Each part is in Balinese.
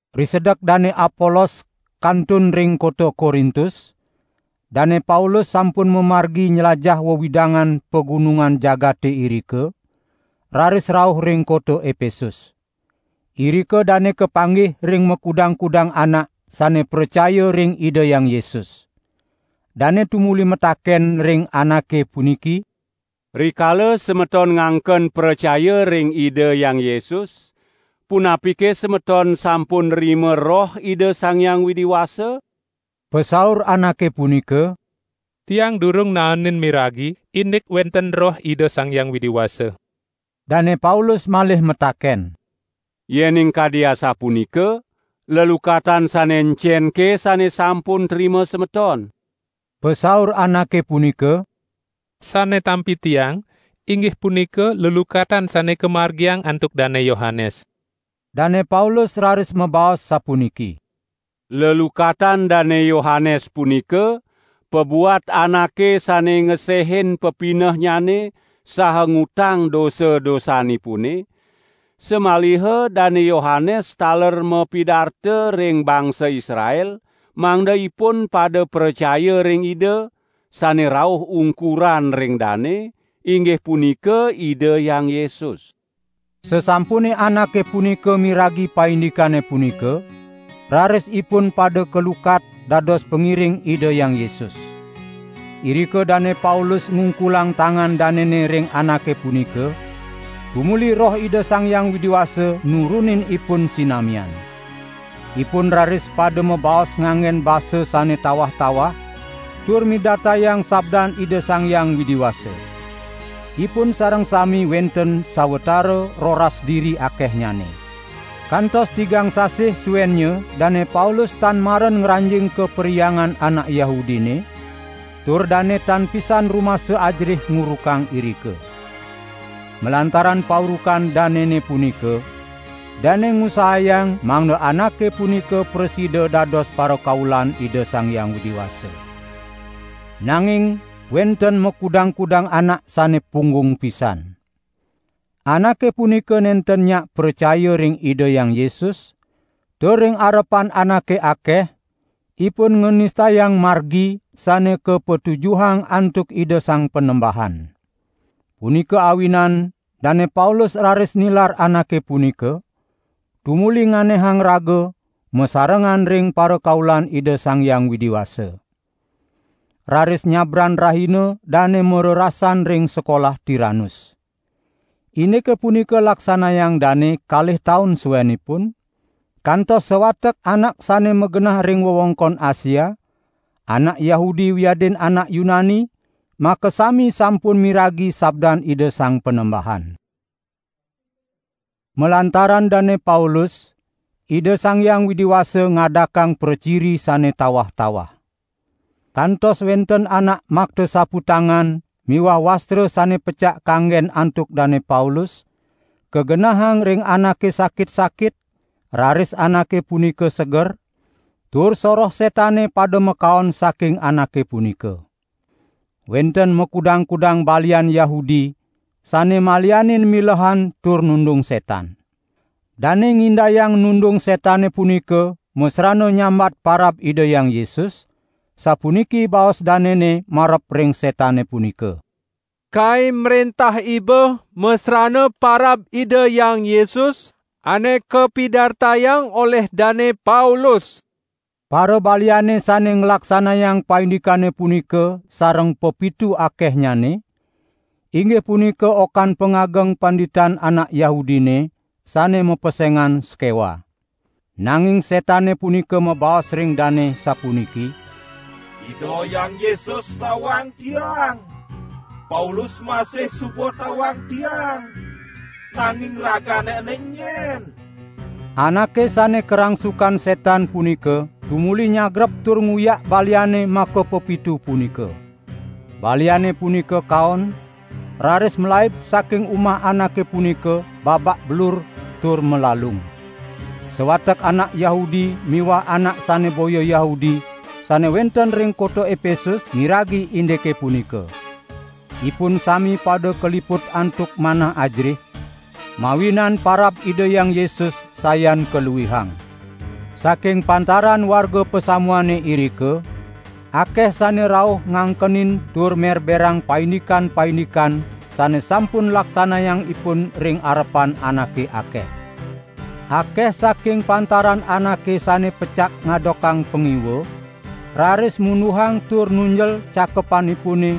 Risedek Dane Apolos kantun ring kota Korintus, Dane Paulus sampun mamargi nylajah wewidangan pagunungan jagate irika, raris rauh ring kota Epesus. Irika dane kapanggih ring makudang-kudang anak sane pracaya ring Ida Hyang Yesus. Dane tumuli mataken ring anake puniki: "Rikala semeton ngangken pracaya ring Ida Hyang Yesus, punapike semeton sampun nrima Roh Ida Sang Hyang Widi Wasa?" Pasaur anake punika: "Tiang durung naenin miragi indik wenten Roh Ida Sang Hyang Widi Wasa." Dane Paulus malih mataken: "Yening kadi asapunika, lelukatan sane encenke sane sampun trima semeton?" Pasaur anake punika: "Sane tampi tiang, inggih punika lelukatan sane kamargiang antuk Dane Yohanes." Dane Paulus raris mabaos sapuniki: "Lelukatan Dane Yohanes punika pabuat anake sane ngesehin pepinehnyane saha ngutang dosa-dosanipune, samaliha Dane Yohanes taler mapidarta ring bangsa Israel mangda ipun pada pracaya ring Ida, sane rauh ungkuran ring dane, inggih punika Ida Hyang Yesus." Sasampune anake punika miragi paindikane punika, raris ipun pada kalukat dados pangiring Ida Hyang Yesus. Irika Dane Paulus ngungkulang tangan danene ring anake punika tumuli Roh Ida Sang Hyang Widi Wasa nurunin ipun sinamian. Ipun raris pada mabaos nganggen basa sane tawah-tawah tur midartayang sabdan Ida Sang Hyang Widi Wasa. Ipun Sareng sami wenten sawatara roras diri akehnyane. Kantos tigang sasih suennya Dane Paulus tan maren ngranjing ka perhyangan anak Yahudine, tur dane tan pisan rumasa ajerih ngurukang irika. Malantaran paurukan danene punika, dane ngusahayang mangda anake punika prasida dados parakaulan Ida Sang Hyang Widi Wasa. Nanging wenten makudang-kudang anak sane punggung pisan. Anake punika nenten nyak pracaya ring Ida Hyang Yesus, tur ring arepan anake akeh ipun nganistayang Margi sane kapatujuhang antuk Ida Sang Panembahan. Punika awinan Dane Paulus raris nilar anake punika, tumuli nganehang raga masarengan ring parakaulan Ida Sang Hyang Widi Wasa. Raris nyabran rahina dane marerasan ring sekolah Tiranus. Indike punika laksanayang dane kalih taun suenipun, kantos sawatek anak sane magenah ring wewengkon Asia, anak Yahudi wiadin anak Yunani makasami sampun miragi sabdan Ida Sang Panembahan. Malantaran Dane Paulus, Ida Sang Hyang Widi Wasa ngadakang praciri sane tawah-tawah. Kantos wenten anak makta saputangan miwah wastra sane pecak kanggen antuk Dane Paulus, kagenahang ring anake sakit-sakit, raris anake punika seger, tur soroh setane pada makaon saking anake punika. Wenten makudang-kudang balian Yahudi sane malianin milehan tur nundung setan. Dane ngindayang nundung setane punika masrana nyambat parab Ida Hyang Yesus, sapuniki baos danene marep ring setane punika: "Kai mrentah iba masrana parab Ida Hyang Yesus, ane kapidartayang olih Dane Paulus." Parabaliane sane nglaksanayang paindikane punika sareng pepitu akehnyane, inggih punika okan pangageng panditan anak Yahudine, sane mapesengan Skewa. Nanging setane punika mabaos ring dane sapuniki: "Ida Hyang Yesus tawang tiang, Paulus masih suba tawang tiang, nanging ragane ene enyen?" Anake sane karangsukan setan punika tumuli nyagrep tur nguyak baliane makapepitu punika. Baliane punika kaon, raris malaib saking umah anake punika babak belur tur malalung. Sawatek anak Yahudi miwah anak sane boya Yahudi sane wenten ring kota Epesus miragi indike punika. Ipun sami pada kaliput antuk manah ajerih, mawinan parab Ida Hyang Yesus sayan kaluihang. Saking pantaran warga pasamuane irika, akeh sane rauh ngangkenin tur merberang paindikan-paindikan sane sampun laksanayang ipun ring arepan anake akeh. Akeh saking pantaran anake sane pecak ngadokang pangiwa, raris munduhang tur nunjel cakepanipune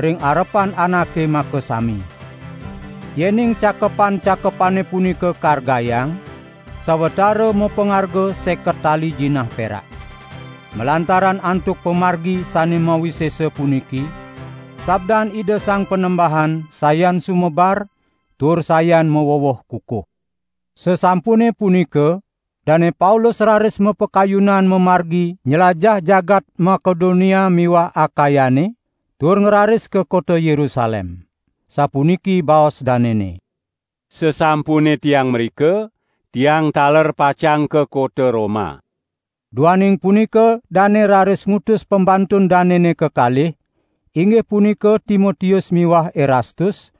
ring arepan anake makasami. Yening cakepan-cakepane punika kargayang, sawatara mapangarga seket tali jinah perak. Malantaran antuk pamargi sane mawisesa puniki, sabdan Ida Sang Panembahan sayan sumebar tur sayan maweweh kukuh. Sasampune punika Dane Paulus raris mapakayunan mamargi nylajah jagat Makedonia miwah Akayane, tur ngraris ka kota Yerusalem. Sapuniki baos danene: "Sasampune tiang mrika tiang taler pacang ka kota Roma." Duaning punika dane raris ngutus pembantun danene kekalih, inggih punika Timotius miwah Erastus,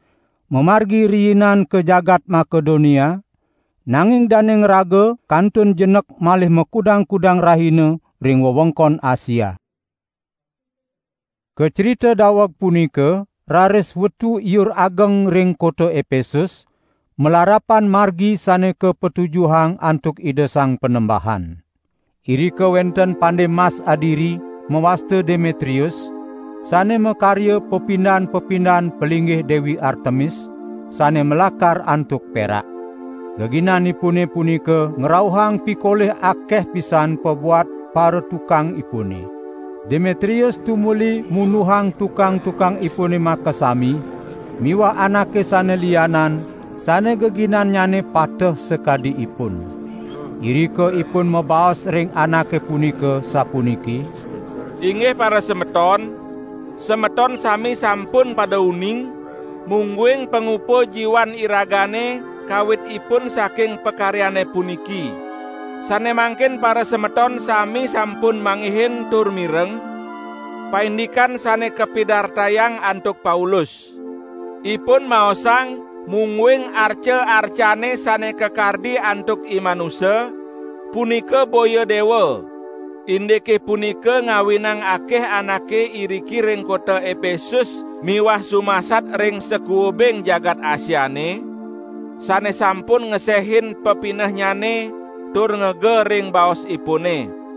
mamargi riinan ka jagat Makedonia, nanging dane ngraga kantun jenek malih makudang-kudang rahina ring wewengkon Asia. Kacrita daweg punika raris wetu iur ageng ring kota Epesus, malarapan Margi sane kapatujuhang antuk Ida Sang Panembahan. Irika wenten pande mas adiri, mawasta Demetrius, sane makarya pepindan-pepindan palinggih Dewi Artemis, sane malakar antuk perak. Geginanipune punika ngrauhang pikolih akeh pisan pabuat paratukangipune. Demetrius tumuli munduhang tukang-tukangipune makasami miwah anake sane lianan sane geginannyane pateh sakadi ipun. Irika ipun mabaos ring anake punika sapuniki: "Inggih parasemeton, semeton sami sampun pada uning, mungguing pangupa jiwan iragane kawitipun saking pakaryane puniki. Sane mangkin parasemeton sami sampun manggihin tur mireng, paindikan sane kapidartayang antuk Paulus. Ipun maosang mungguing arca-arcane sane kakardi antuk imanusa, punika boya dewa. Indike punika ngawinang akeh anake iriki ring kota Epesus miwah sumasat ring sakuubing jagat Asiane, sane sampun ngesehin pepinehnyane, tur ngega ring baosipune.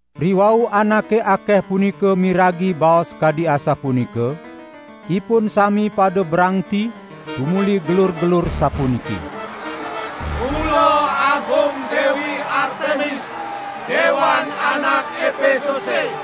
Riwau anake akeh punika miragi baos kadi asapunika, ipun sami pada brangti tumuli gelur-gelur sapuniki: "Mula agung Dewi Artemis, dewan anak Epesuse!"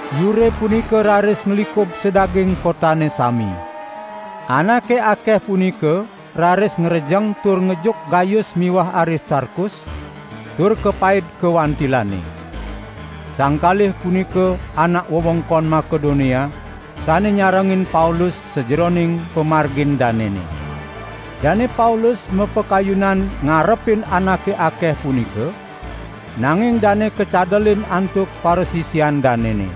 Iure punika raris nglikub sadaging kotane sami. Anake akeh punika raris ngrejeng tur ngejuk Gayus miwah Aristarkus, tur kapaid ka wantilane. Sang kalih punika anak wewengkon Makedonia sane nyarengin Paulus sajeroning pamargin danene. Dane Paulus mapakayunan ngarepin anake akeh punika, nanging dane kacadelin antuk parasisian danene.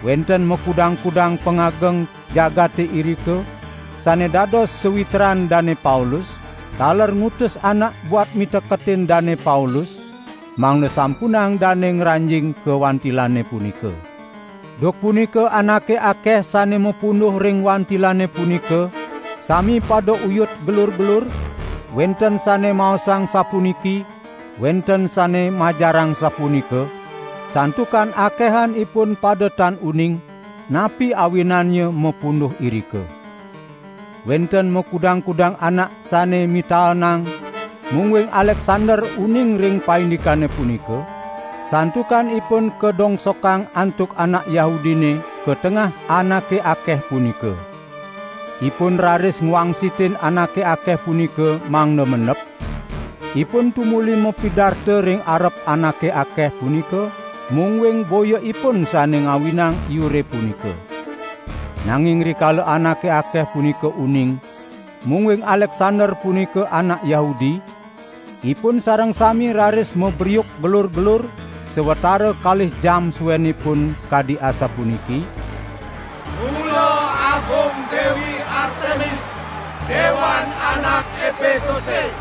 Wenten makudang-kudang pangageng jagate irika, sane dados sawitran Dane Paulus, taler ngutus anak buat miteketin Dane Paulus, mangda sampunang dane ngranjing ka wantilane punika. Duk punika anake akeh sane mapunduh ring wantilane punika sami pada uyut gelur-gelur, wenten sane maosang sapuniki, wenten sane majarang sapunika, santukan akehan ipun pada tan uning, napi awinannya mapunduh irika. Wenten makudang-kudang anak sane mitaenang mungguing Aleksander uning ring paindikane punika, santukan ipun kadongsokang antuk anak Yahudine ka tengah anake akeh punika. Ipun raris ngwangsitin anake akeh punika mangda mendep, ipun tumuli mapidarta ring arep anake akeh punika mungguing boya ipun sane ngawinang iure punika. Nanging rikala anake akeh punika uning, mungguing Aleksander punika anak Yahudi, ipun sareng sami raris mabriuk gelur-gelur, sawatara kalih jam suenipun kadi asapuniki: "Mula agung Dewi Artemis dewan anak Epesuse."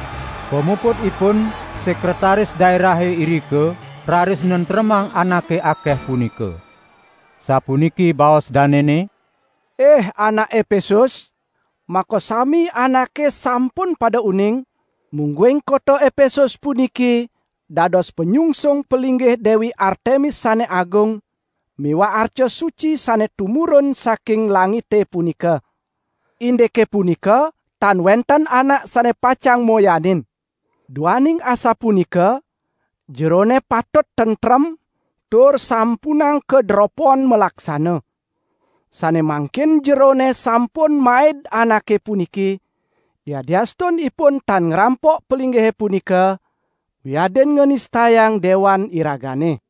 Pamuputipun sekretaris daerahe irika raris nentremang anake akeh punika. Sapuniki baos danene: "Ih anak Epesus! Makasami anake sampun pada uning, mungguing kota Epesus puniki dados panyungsung palinggih Dewi Artemis sane agung, miwah arca suci sane tumurun saking langite punika. Indike punika tan wenten anak sane pacang moyanin. Duaning asapunika jerone patut tentrem tur sampunang kaderopon malaksana. Sane mangkin jerone sampun maid anake puniki, yadiastun ipun tan ngrampok palinggihe punika, wiadin nganistayang dewan iragane.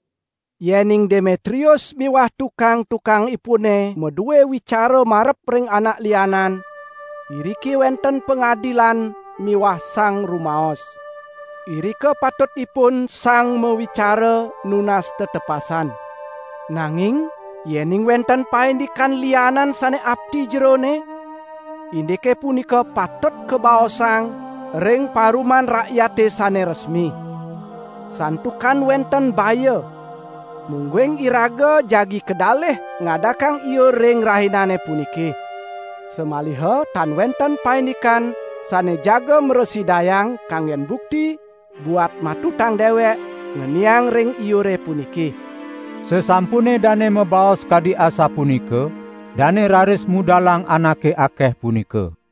Yening Demetrius miwah tukang-tukangipune madue wicara marep ring anak lianan, iriki wenten pangadilan miwah sang rumaos. Irika patutipun sang mawicara nunas tetepasan. Nanging yening wenten paindikan lianan sane apti jerone, indike punika patut kabaosang ring paruman rakyate sane resmi. Santukan wenten baya, mungguing iraga jagi kadalih ngadakang iur ring rahinane puniki. Samaliha tan wenten paindikan sane jaga mrasidayang kanggen bukti buat matutang dewek, ngeniang ring iure puniki." Sasampune dane mabaos kadi asapunika, dane raris mudalang anake akeh punika.